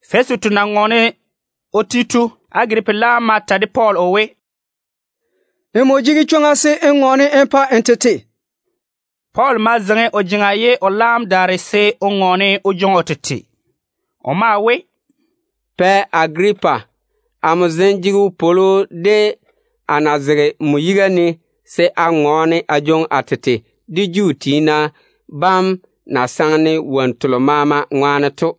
Fɛsitu na ŋɔɔne o ti to, Agiripa laam ma ta de Pɔɔl o we, “Nmo jege chwoŋa se n ŋɔɔne n pa n tete.” Pɔɔl ma zeiŋi o jeŋa ye o laam daare se o ŋɔɔne o jwoŋi o tete. O maa we: “Pɛ Agiripa, amo zem jege wopwolo de a na zege nmo yiga ne se a ŋɔɔne a jwoŋi a tete de Juu tiina bam na saŋe-ne wonnu telo maama ŋwaane to.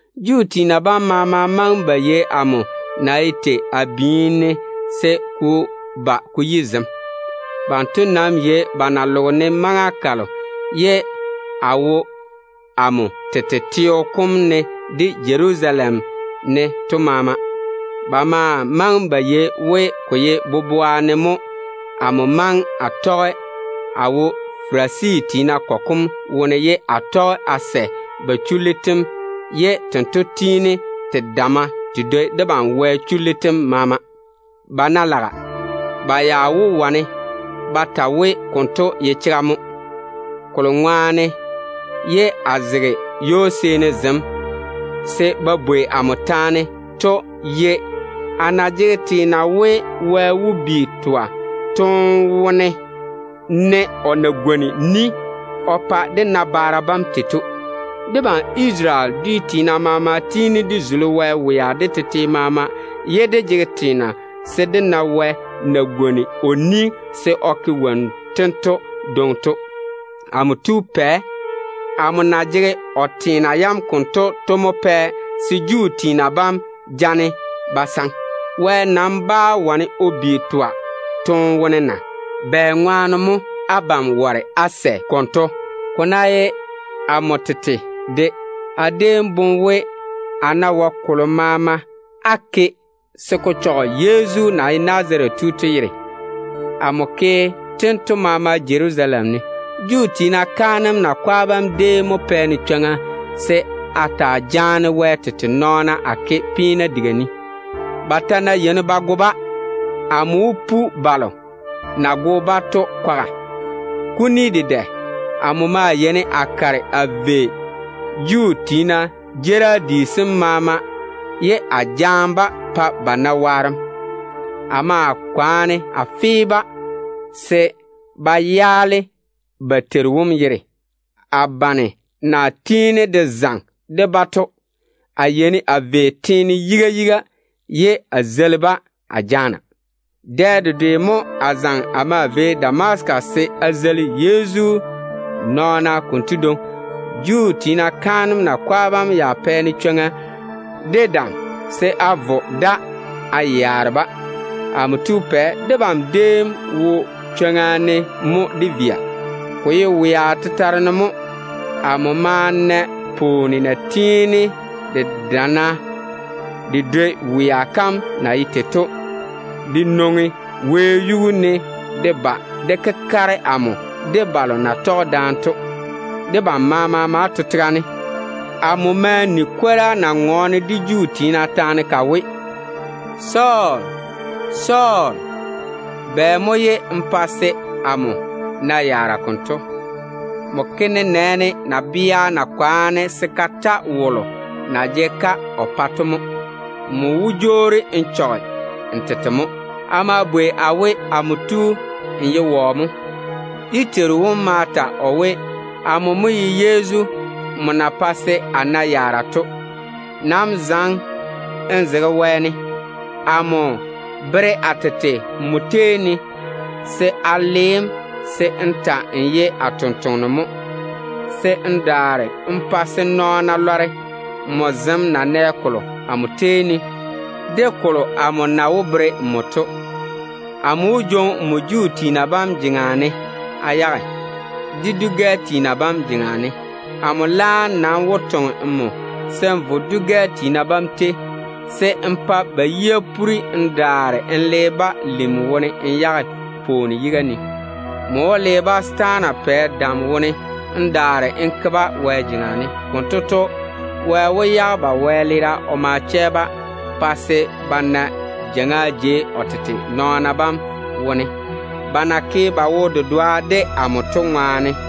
Juu tiina bam maama maŋe ba yei amo ŋwea na ye tei a biini ne, se ko ba ko yi zem. Banto nam yei ba na loge-ne maŋa kalo ye a wo amo tete teo kom ne de Jerusalem ne to maama. Ba maa maŋe ba yei we ko ye boboa ne mo amo maŋe a tɔge a wo Farisi tiina kɔgɔ kom wone ye a tɔge a sɛ ba chullu tem na tiini te damma te dwoi debam Wɛ chullu tem maama to. Ba ná laga, ba ya wó wane ba ta we konto ye chega mo. Woŋo kolo ŋwaane ye a zege ywo-seeni zem se ba bwei amo taane to ye a na jege teena we, Wɛ wó bi twa toone wone ne o na pwooli de dé nabaara bam se o ke tei to. Debam Isarele dwia fuga-yalei maama tiini dé zuli Wɛ wea de tete maama ye dé jege teena se dé na Wɛ na gwoni o ni se o ke wonnu tento dwoŋi to. Pɛ, amo na jege o teena yam konto to mo pɛ se Juu tiina bam jege-ne ba saŋa. Wɛ nam bá wane o bi twa toone wone na? Bɛŋwaane mo abam ware se á sɛ konto? Ko ná ye amo tete de, a déem boŋe we, a ná wae kolo maama a ke se ko chɔge Yezu na ye Nazarete tu to yere. Amo ke tento maama Jerusalem ne. Juu tiina kaanem yiga tiina bam déem mo pɛ-ne chwoŋa se a taa jaane Wɛ tete nɔɔna a ke peena diga ne. Ba ta ná yeini ba go-ba, amo wó pu balo na go-ba to kwaga. Kuni dedɛ amo maa yeini a kare a vei Juu tiina jeerim di sem maama ye a jaane-ba a pa ba na waarem. A maa kwaane a fe-ba se ba twe ba Teiru wom yere. A bane na tiini de zaŋe de-ba to, a yeini a tɔge ba nɛ a vei teene yiga yiga ye a jege-ba a bɛɛsa. Dɛ dedwe mo a zaŋe a maa vei Damasika se a zeili Yezu nɔɔna konto dwoŋi. Juu tiina kaanem yiga tiina bam ya pɛ-ne chwoŋa de dam se a vo da a yaare-ba. Pɛ, debam déem wo chwoŋa ne mo dé via. Ko ye wea tetare ne mo. Amo ma na pwooni na tiini de dana de dwoi wea kam na ye tei to de nwoŋi wɛyuu ne de ba de kekare amo de balo na tɔge de amo to. Debam maama ma to tega ne. Amo ma ni kwora na ŋɔɔne de Juu tiina taane ka we, ‘Sɔɔl, Sɔɔl, bɛ mo ye n jege-ne n bɛɛsa konto? Nmo ke nenɛɛne nabea ná kwaane se ka ta wolo na jege-ka o pa to mo. Nmo wó jwoori n chɔge n tete mo.’ A ma bwei a we, ‘Amo tu, n ye wɔ mo?’ Dé Teiru wom ma ta o we, ‘Amo ye Yezu wolo nmo na jege n bɛɛsa to mo. Nam zaŋe n zege wɛɛne. Amo veere a tete a pa nmo se a wane a le‑m se n ta‑n ye a tontoŋeno mo, se n daare n pa se nɔɔna lɔre nmo zem na nɛ kolo amo tei ne, de kolo amo na wó bere nmo to. Amo wó jwoŋi nmo Juu tiina bam jeŋa ne a yage, de dwi-gɛ tiina bam jeŋa ne. Amo laam nam wó toŋe‑m se n vo dwi-gɛ tiina bam tei, se n pa ba yia puri n daare n le-ba lim wone n yage pwooni yiga ne. Nmo wó le-ba setaana pɛ dam wone n daare n ke-ba Wɛ jeŋa ne. Konto to, Wɛ wó yage ba wɛleera o ma chɛ-ba pa se ba na jeiŋa jei o tete nɔɔna bam wone, ba na ke ba wo-dedoa de amo to ŋwaane.’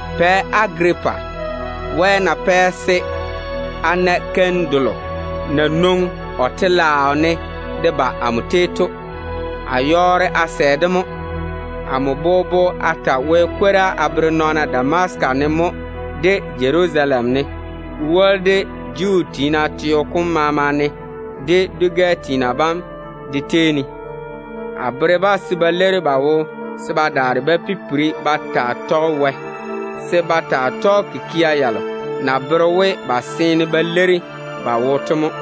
Pɛ Agiripa, Wɛ na le o bere-ne keim delo na nwoŋi o telaao ne to, a yɔɔre a sɛ-de mo. Amo bobo a ta Wɛ kwora a bere nɔɔna Damasika ne mo, de Jerusalem ne, ko woli de Judea teene dem maama ne, de dwi-gɛ tiina bam de tei ne. A bere-ba se ba leiri ba wo se ba daare ba pipiri ba taa tɔge Wɛ, se ba taa tɔge kikia yalo na wó bere we ba seene ba leiri ba wo to mo.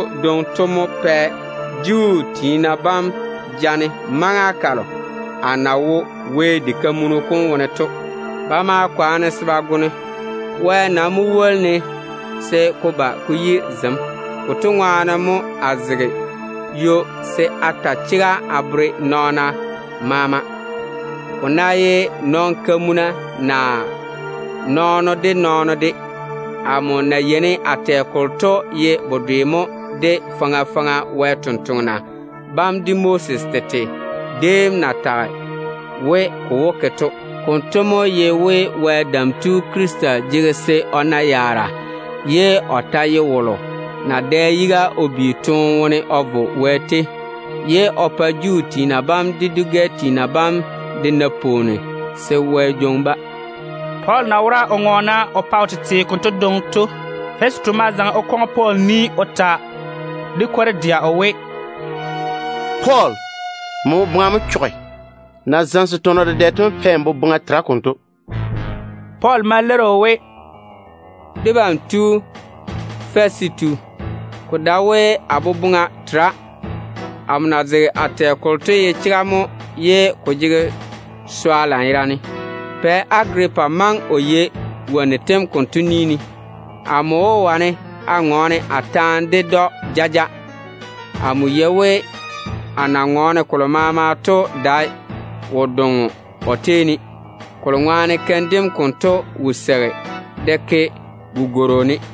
Konto ŋwaane mo Juu tiina bam jaane-ne maŋa kalo a na wo Wɛ diga kam ne to. Ba ma kwaane se ba go-ne. Wɛ nam mo woli-ne se ko ba ko yi zem. Konto ŋwaane mo a zege ywo se a ta chega a bere nɔɔna maama, ko ná ye nɔn-kamuna naa nɔɔno de nɔɔno de. Amo na yeini a tɛ kolo to ye bedwe mo de faŋa faŋa Wɛ sampwori sem de Moses tete déem na tage we ko wó ke to. Konto mo ye we Wɛ Dam Tu Krista jege se o na yaara ye o ji wolo na wó da yiga o bi toone wone o vo Wɛ tei. O maa wó pa Juu tiina bam de dwi-gɛ tiina bam de na pwooni se Wɛ jwoŋi-ba.” Pɔɔl na wora o ŋɔɔne o pa o tete konto dwoŋi to, Fɛsitu ma zaŋe o ta de kwor-dɛa o we, “Pɔɔl, nmo yirisi mo! Nmo na zamese tɔnɔ dedɛ to mo pɛ n boboŋa tera konto.” Pɔɔl ma leiri o we, “Debam tu Fɛsitu, ko dae we a yirisi. Amo na zege a tɛ kolo to ye chega mo ye ko jege swa lanyerane. Pɛ Agiripa maŋe o yei wonnu tem konto ni ne. Amo wó wane a ŋɔɔne a taane ded‑o jaja. Amo yei we a na ŋɔɔne kolo maama to dae wo-doŋo o tei ne, kolo ŋwaane keim dem konto wo seigi de ke gugworo ne.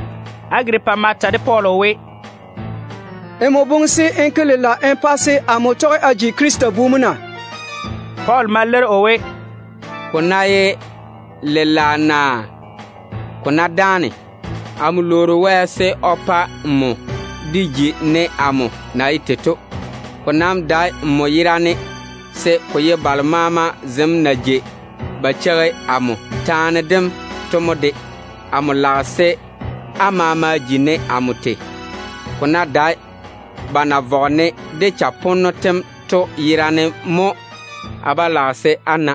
Agiripa ma ta de Pɔɔl o we, “Nmo boŋe se n ke lela n pa se amo tɔge a ji Krista bu mo na?” Pɔɔl ma leiri o we, “Ko ná ye lela naa ko ná dáane, amo lwoori Wɛ se o pa nmo de ji ne amo na ye tei to. Ko nam dae nmo yerane, se ko ye balo maama zem na jei ba cheigi amo taane dem to mo de. Amo lage se á maama ji ne amo tei, ko ná dae ba na vɔge-ne de chaponno tem to yerane mo a ba lage se á na.”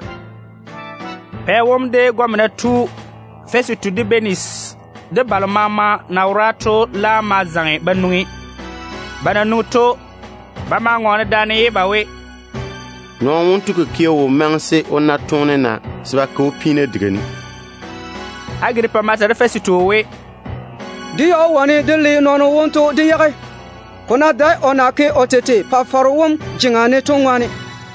Pɛ wom, de gɔmena tu Fɛsitu, de Bɛnisi, de balo maama na wora to laam ma zaŋe ba nwoŋi. Ba na nwoŋi to, ba maa ŋɔɔne daane ye ba we, “Nɔɔno wonto kikia wo maŋe se o na toone naa se ba ke‑o peena diga ne.” Agiripa ma ta de Fɛsitu o we, “Dé ya wó wane dé le nɔɔno wonto dé yage, ko ná dae o na ke o tete Pa-faro wom jeŋa ne to ŋwaane.”